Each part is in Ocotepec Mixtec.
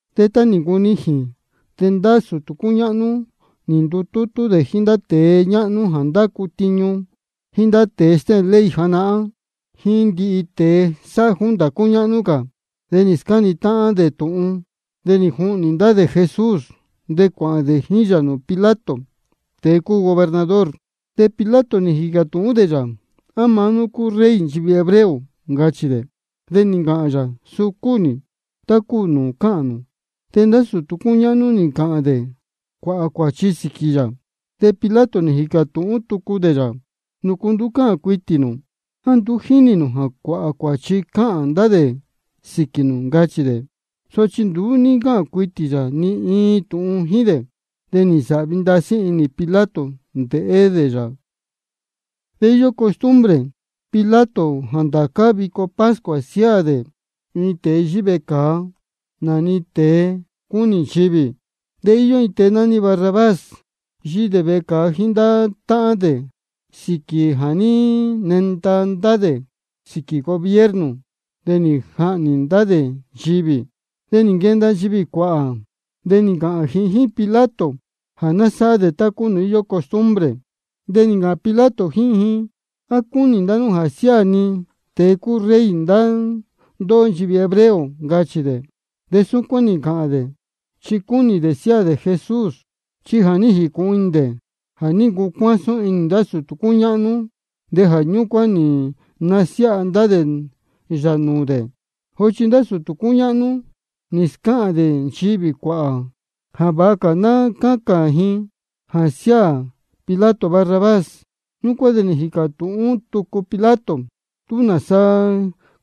De tá nī ncunijīn, de ndá sūtū cúñáhnú nī ndutútú dē jíín ndá tēe ñáhnú jā ndácu tiñu, jíín ndá tēe stéhēn ley janahán, jíín ndihi tēe sáhá junta cúñáhnú cā, de nī scáni táhán dē tūhun. De nī juhnī ndá dē Jesús de cuāhān dē jíín yā nūū Pilato, tēe cúu gobernador. De Pilato nī jīcā tūhún dē yā: ¿A maá nú cúu Rey nchivī hebreo? ncachī dē. De nī ncāhān yā: Suu cúu nī, tá cúu nūū cáhān nū. De ndá sūtū cúñáhnú nī ncāhān dē cuāhā cuāchi sīquī yā. De Pilato nī jīcā tūhún tucu dē yā: ¿Nūcu nduú cáhān cuitī nū? ¿A nduú jínī nū jā cuāhā cuāchi cáhān ndá dē sīquī nū? ncachī dē. Sochi nduú ní ncáhān cuitī yā ni iin tūhun jíín dē. De nī nsāhvi ndasí inī Pilato ndéhé dē nūū yā. De íyó costumbre Pilato jā ndācá vico pascua siáā dē iin tēe yíhí vecāa, nā-ni tēe cúnī nchivī. De íyó iin tēe nání Barrabás, yíhí dē vecāa jíín ndá táhán dē sīquī jā ní nenda ndá dē sīquī gobierno de nī jahnī ndá dē ndīyi. De nī nquenda nchivī cuāhā, de nī ncāhān ji jíín Pilato jā ná sáhá dē tá-ni íyó costumbre dē. De nī ncāhān Pilato jíín ji: ¿A cúnī ndá nú jā siáā ni tēe cúu Rey ndá ndóhó nchivī hebreo? ncachī dē. Súcuán nī ncāhān dē, chi cúnī dē siáā dē Jesús. Chi ja nī jīcūhun inī dē jā ní ncucuásún inī ndá sūtū cúñáhnú, de jā ñúcuán nī nasiáha ndá dē yā nūū dē. Sochi ndá sūtū cúñáhnú nī scáhān dē nchivī cuāhā jā vāha cā ná cácān ji jā siáā Pilato Barrabás. Ñúcuán de nī jīcā tūhún tucu Pilato: ¿Túsaá de nāsa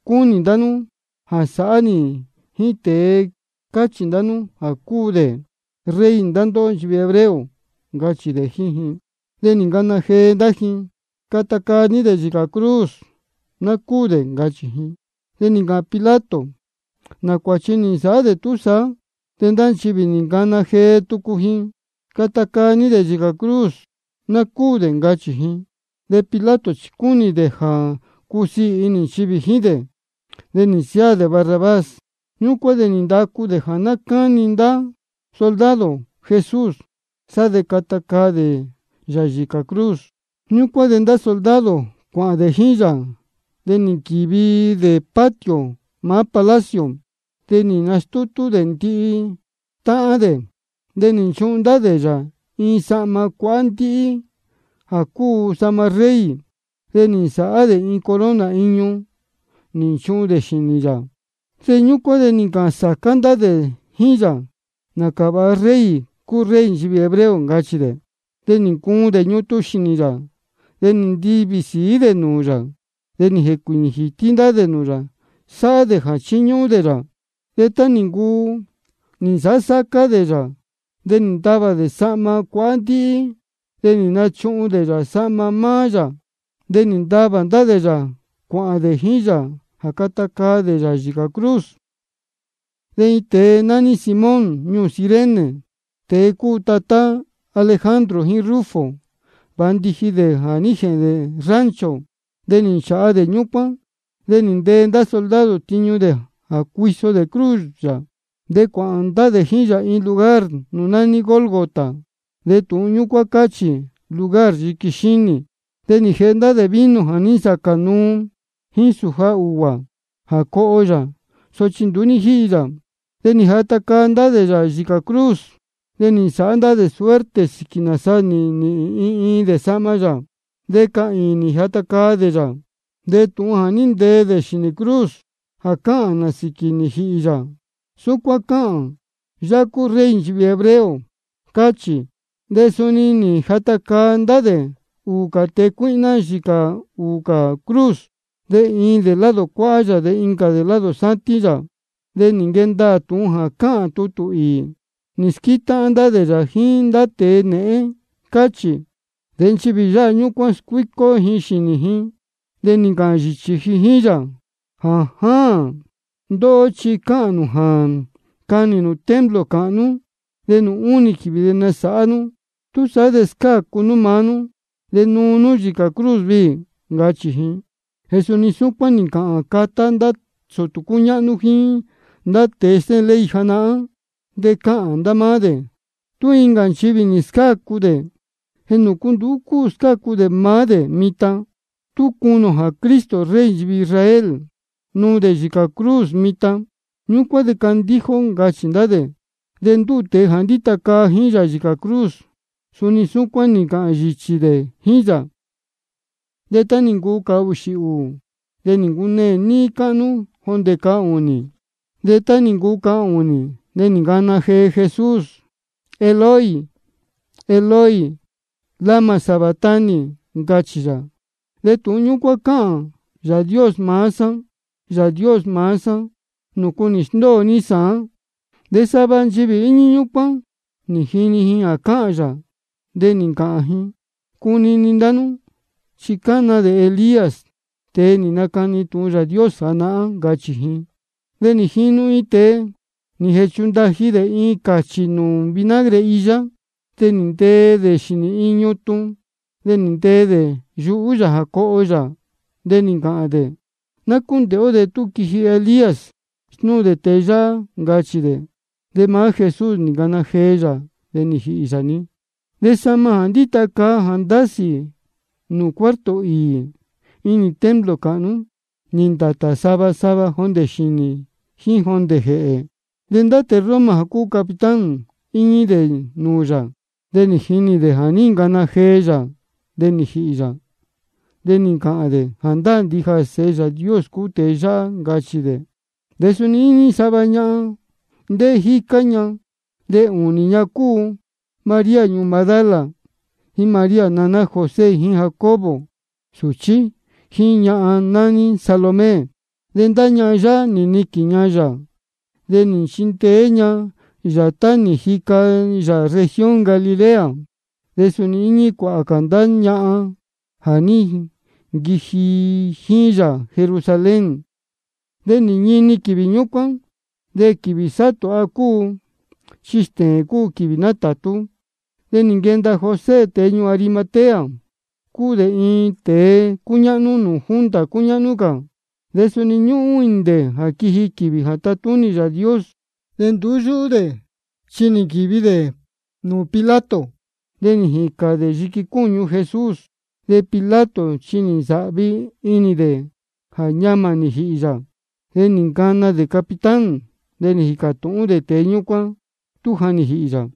cúnī ndá nú jā sāhá nī jíín tēe jā cáchī ndá nú jā cúu dē Rey ndá ndóhó nchivī hebreo? ncachī dē jíín ji. De nī ncana jee ndá ji: Cata caa ní dē yīcā cruz, ná cúū dē, ncachī ji. De nī ncāhān Pilato: ¿Nā cuāchi nī nsāhá dē túsaá? De ndá nchivī nī ncana jee tucu ji: Cata caa ní dē yīcā cruz, ná cúū dē, ncachī ji. De Pilato chi cúnī dē jā cusiī inī nchivī jíín dē, de nī nsiáā dē Barrabás. Ñúcuán de nī ndacu dē jā ná cáni ndá soldado Jesús, sá de cata caa dē yā yīcā cruz. Ñúcuán de ndá soldado cuāhān dē jíín yā, de nī nquīvi dē patio maá palacio. De nī nastútú dē ndihi táhán dē. De nī nchuhun ndá dē yā iin sahma cuahá ndíhí jā cúu sahma rey. De nī nsāhá dē iin corona iñu, nī nchuhun dē xīnī yā. Ñúcuán de nī ncāhān sācá ndá dē jíín yā: Nācā vāha rey cúu Rey nchivī hebreo, ncachī dē. De nī ncuun dē ñutun xīnī yā, de nī ntivī sīí dē nūū yā, de nī jēcuīñī jītí ndá dē nūū yā, sáhá dē jā chíñúhún dē yā. De tá nī ncuu nī nsāhá sácá dē yā, de nī ntavā dē sahma cuahá ndíhí, de nī nachuhun dē yā sahma maá yā. De nī ntavā ndá dē yā cuāhān dē jíín yā jā cata caa dē yā yīcā cruz. De iin tēe nání Simón ñuū Cirene, tēe cúu tatá Alejandro jíín Rufo, vāndiji dē jā ní jēhēn dē rancho. De nī nchāha dē ñúcuán, de nī ntee ndá soldado tiñu dē jā cuiso dē cruz yā. De cuāhān ndá dē jíín yā iin lugar nūū nání Gólgota, de tūhun ñúcuán cáhān: Lugar Yiqui Xínī. De nī jēhe ndá dē vino jā ní nsacā nuu jíín sūja ūguā jā coho yā, sochi nduú ní jíhi yā. De nī jata caa ndá dē yā yīcā cruz. De nī nsāhá dē suerte sīquī nāsa nīhīn iin iin dē sahma yā. De cahīīn nī jata caa dē yā. De tūhun jā ní ntee dē xīnī cruz jā cáhān nā sīquī nī jīhī yā, súcuán cáhān: Yáhá cúu Rey nchivī hebreo, cáchī. De suni nī jata caa ndá dē ūū tēe cuíhná yīcā ūū cā cruz, iin dē lado cuáhá yā, de incā dē lado sátín yā. De nī nquee ndaā tūhun jā cáhān tutū īī: Nī squétáhán ndá dē yā jíín ndá tēe nēhén, cáchī. De nchivī jā yáha ñúcuán, scuícó ji xīnī ji, de nī ncāhān yīchī ji jíín yā: Jājáān. Ndóhó chi cáhān nū jā canī nū templo cāhnú, de nūū únī quīvī de nasāhá nú. Túsaá de scácu nú maá nú, de nuu nú yīcā cruz viī, ncachī ji. De suni súcuán nī ncāhān catá ndá sūtū cúñáhnú jíín ndá tēe stéhēn ley janahán, de cáhān ndá máá dē: Tú incā nchivī nī scácu dē, ¿de nūcu nduú cúu scácu dē maá dē mitan? Tú cunī ō jā Cristo, Rey nchivī Israel, nuu dē yīcā cruz mitan, ñúcuán de candíja ó, ncachī ndá dē. De ndúū tēe jā ndíta caa jíín yā yīcā cruz, suni súcuán nī ncāhān yīchī dē jíín yā. De tá nī ncuu cahūxī ūū, de nī ncuneē níí cáhnú jondē cahūnī. De tá nī ncuu cahūnī, de nī ncana jee Jesús: Eloi, Eloi, ¿lama sabactani? ncachī yā. De tūhun ñúcuán cáhān: Yāā Dios maá sá, Yāā Dios maá sá, ¿nūcu nī sndóo ní sāán? De sava nchivī íñí ñúcuán, nī jini ji jā cáhān yā, de nī ncāhān ji: Cunini ndá nú, chi cána dē Elías, tēe nī nacani tūhun Yāā Dios janahán, ncachī ji. De nī jinu iin tēe, nī jēchundaji dē iin cāchī nūū vinagre iyá. De nī ntee dē xīnī iin ñutun, de nī ntee dē yuhú yā jā coho yā. De nī ncāhān dē: Ná cúndēhé ó tú quiji Elías snúu dē tēe yáhá, ncachī dē. De maá Jesús nī ncana jee yā, de nī jīhī yā-ni. Sá de sahma jā ndíta caa jā ndásī nūū cuarto īī inī templo cāhnú, nī ndātā sava sava jondē xīnī jíín jondē jēhē. De tēe Roma jā cúu capitán, íñí dē nūū yā, de nī jinī dē jā ní ncana jee yā de nī jīhī yā. De nī ncāhān dē: Jāndáā ndija jā Sēhe Yāā Dios cúu tēe yáhá, ncachī dē. De suni íñí sava ñahan, ndéhé jícá ña. De ūnī ña cúu María ñuū Magdala, jíín María naná José jíín Jacobo suchí, jíín ñahan nání Salomé. De ndá ñahan yáhá nī niquīn ña yā, de nī nchindeé ña yā tá nī jica yā región Galilea. De suni íñí cuāhā cā ndá ñahan jā ní nquiji jíín yā Jerusalén. De nī ñini quīvī ñúcuán. De quīvī sátūha cúu, chi stēēn cúu quīvī nátātú. De nī nquenda José, tēe ñuū Arimatea. De cúu dē iin tēe cúñáhnú nūū junta cúñáhnú cā. De suni ñúhún inī dē jā quiji quīvī jā tatúnī Yāā Dios. De nduú yúhú dē chi nī nquīvi dē nūū Pilato, de nī jīcān dē yiqui cúñu Jesús. De Pilato chi nī nsāhvi inī dē jā ñamā nī jīhī yā. De nī ncana dē capitán, de nī jīcā tūhún dē tēe ñúcuán tú ja nī jīhī yā.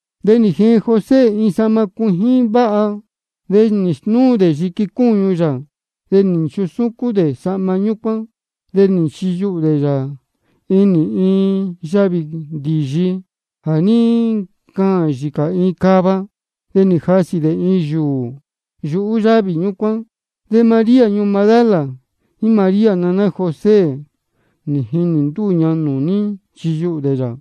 De nī jeen José iin sahma cuijín váha. De nī snúu dē yiqui cúñu yā, de nī nchusúcún dē sahma ñúcuán. De nī nchiyuhū dē yā inī iin yavī ndīyi jā ní ncaān yīcā iin cava. De nī jasī dē iin yūū yuhú yávī ñúcuán. De María ñuū Magdala, jíín María naná José, nī jinī ndúū ña nūū ní nchiyuhū dē yā.